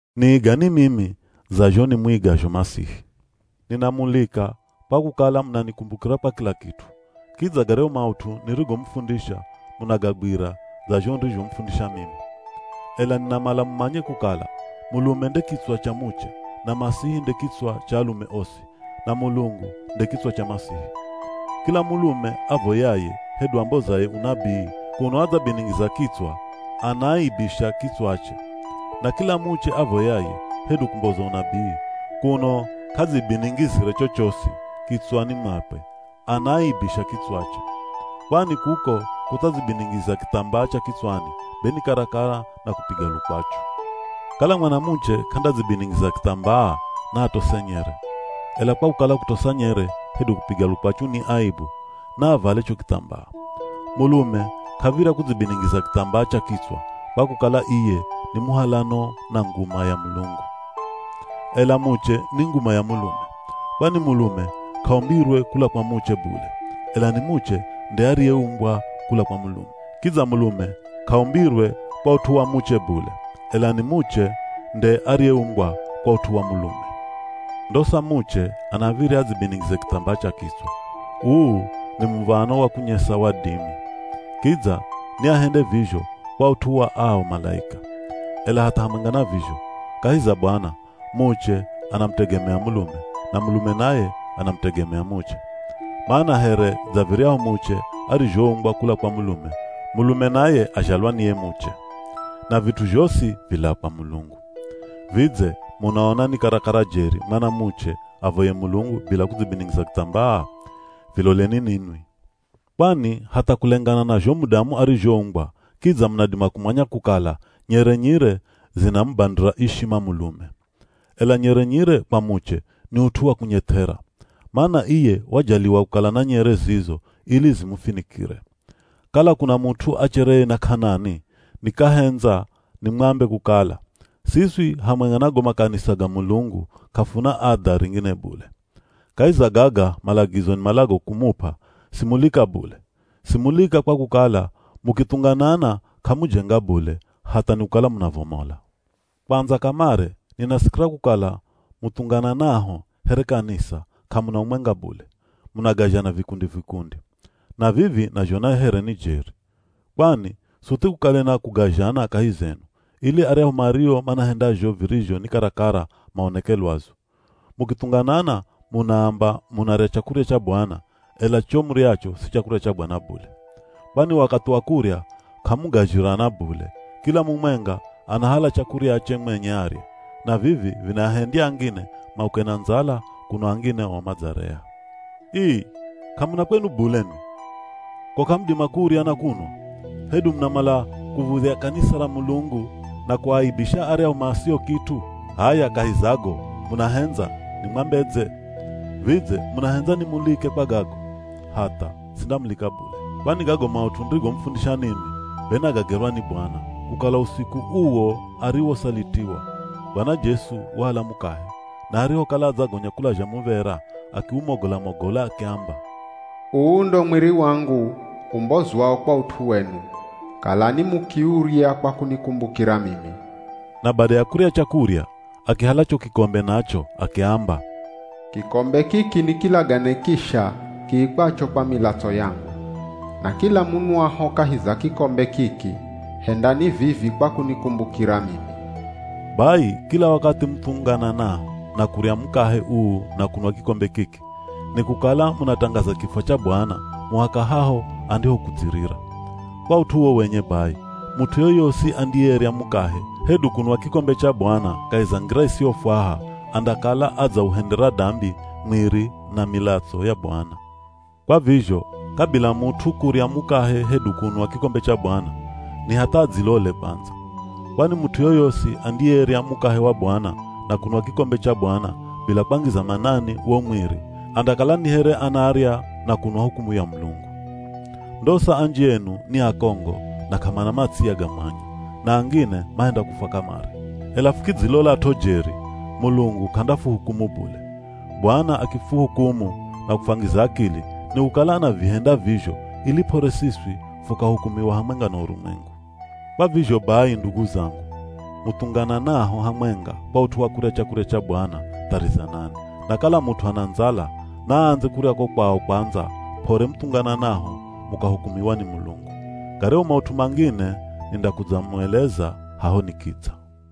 Niigani mimi dza zho nimuigazho Masihi. Ninamulika kwa kukala munanikumbukira kwa kila kit'u, kidza garyahu maut'u nirigomufundisha munagagwira dza zho nirizhomufundisha mimi. Ela ninamala mumanye kukala mulume nde kitswa cha muche, na Masihi nde kitswa cha alume osi, na Mulungu nde kitswa cha Masihi. Kila mulume avoyaye, hedu ambozaye unabii kuno adzabiningiza kitswa, anaaibisha kitswache. Na kila muche avoyaye, hedu kumboza unabii, kuno k'adzibiningizire chochosi kitswani mwakwe, anaaibisha kitswache. Kwani kuko kutsadzibiningiza kithambaa cha kitswani be ni karakara na kupiga lukwachu. Kala mwanamuche k'andadzibiningiza kithambaa, naatose nyere. Ela kwa kukala kutosa nyere hedu kupiga lukwachu ni aibu, naavale cho kithambaa. Mulume k'av̱irya kudzibiningiza kithambaa cha kitswa kwa kukala iye ni muhalano na nguma ya Mulungu. Ela muche ni nguma ya mulume. Kwani mulume k'aumbirwe kula kwa muche bule, ela ni muche nde ariyeumbwa kula kwa mulume. Kidza mulume k'aumbirwe kwa ut'u wa muche bule, ela ni muche nde ariyeumbwa kwa ut'u wa mulume. Ndosa muche anav̱irya adzibiningize kithambaa cha kitswa. Uu ni muv̱ano wa kunyesa wadimi. Kidza ni ahende vizho kwa ut'u wa ao malaika. Ela hatha hamwenga na vizho, kahi za Bwana, muche anamutegemea mulume, na mulume naye anamutegemea muche. Mana here dza viryahu muche arizhoumbwa kula kwa mulume, mulume naye azhalwa ni ye muche. Na vit'u zhosi vilaa kwa Mulungu. Vidze munaona ni karakara jeri mwanamuche avoye Mulungu bila kudzibiningiza kithambaa? Viloleni ninwi. Kwani hatha kulengana na zho mudamu arizhoumbwa kidza munadima kumanya kukala nyere nyire zinamubandira ishima mulume. Ela nyere nyire kwa muche ni ut'u wa kunyeth'era. Mana iye wajaliwa kukala na nyere zizo ili zimufinikire. Kala kuna mut'u achereye na k'anani, nikahendza nimwambe kukala, siswi hamwenga na go makanisa ga Mulungu k'afuna adha ringine bule. Kahi za gaga malagizo nimalago kumup'a, simulika bule. Simulika kwa kukala, mukithunganana k'amujenga bule, hatha nikukala munavomola. Kwandza kamare, ninasikira kukala muthungananaho here kanisa k'amuna umwenga bule, munagazhana vikundi-vikundi. Na vivi nazhona here ni jeri. Kwani suthi kukale na kugazhana kahi zenu, ili aryahu mario manahenda zho virizho ni karakara maoneke lwazu. Mukithunganana munaamba munarya chakurya cha Bwana, ela cho muryacho si chakurya cha Bwana bule. Kwani wakathi wa kurya k'amugazhirana bule, kila mumwenga anahala chakuryache mwenye arye. Na vivi vinaahendya angine mauke na ndzala, kuno angine o madzarea. Ii! K'amuna kwenu bule nwi? Ko k'amudima kurya na kunwa? Hedu munamala kuv̱udhya kanisa ra Mulungu na kuaaibisha aryahu masio kit'u? H'aya kahi za go munahendza nimwambedze? Vidze munahendza nimulike kwa gago? Hatha, sindamulika bule. Kwani gago maut'u nirigomufundisha ninwi be nagagerwa ni Bwana, kukala usiku uwo ariwosalitiwa, Bwana Jesu wahala mukahe, na arihokala adzagonya kulazha muv̱era akiumogola-mogola akiamba, “Uu ndo mwiri wangu umbozwao kwa ut'u wenu, kalani mukiurya kwa kunikumbukira mimi.” Na bada ya kurya chakurya, akihala cho kikombe nacho akiamba, “Kikombe kiki ni kilagane kisha kiikwacho kwa milatso yangu. Na kila munwaho kahi za kikombe kiki, hendani vivi kwa kunikumbukira mimi.” Bai, kila wakathi muthungananaho na kurya mukahe uu na kunwa kikombe kiki, nikukala munatangaza kifwa cha Bwana muhaka haho andihokudzirira. Kwa ut'u uwo wenye bai, mut'u yoyosi andiyerya mukahe, hedu kunwa kikombe cha Bwana kahi za ngira isiyofwaha, andakala adzauhendera dambi mwiri na milatso ya Bwana. Kwa vizho kabila mut'u kurya mukahe hedu kunwa kikombe cha Bwana, ni hatha adzilole kwandza. Kwani mut'u yoyosi andiyerya mukahe wa Bwana na kunwa kikombe cha Bwana bila kwangiza manani wo mwiri, andakala ni here anarya na kunwa hukumu ya Mulungu. Ndosa anji enu ni akongo na k'amana matsiya ga mwanya, na angine mahenda kufwa kamare. Ela fukidzilolat'o jeri, Mulungu k'andafuhukumu bule. Bwana akifuhukumu na kufwangiza akili, nikukala anavihenda vizho ili p'ore siswi fukahukumiwa hamwenga na urumwengu. Kwa vizho bai ndugu zangu, muthungananaho hamwenga kwa ut'u wa kurya chakurya cha Bwana, tharizanani. Na kala mut'u ana ndzala, naaandze kurya ko kwao kwandza p'ore muthungananaho mukahukumiwa ni Mulungu. Garyahu maut'u mangine nindakudzamueleza haho nikidza.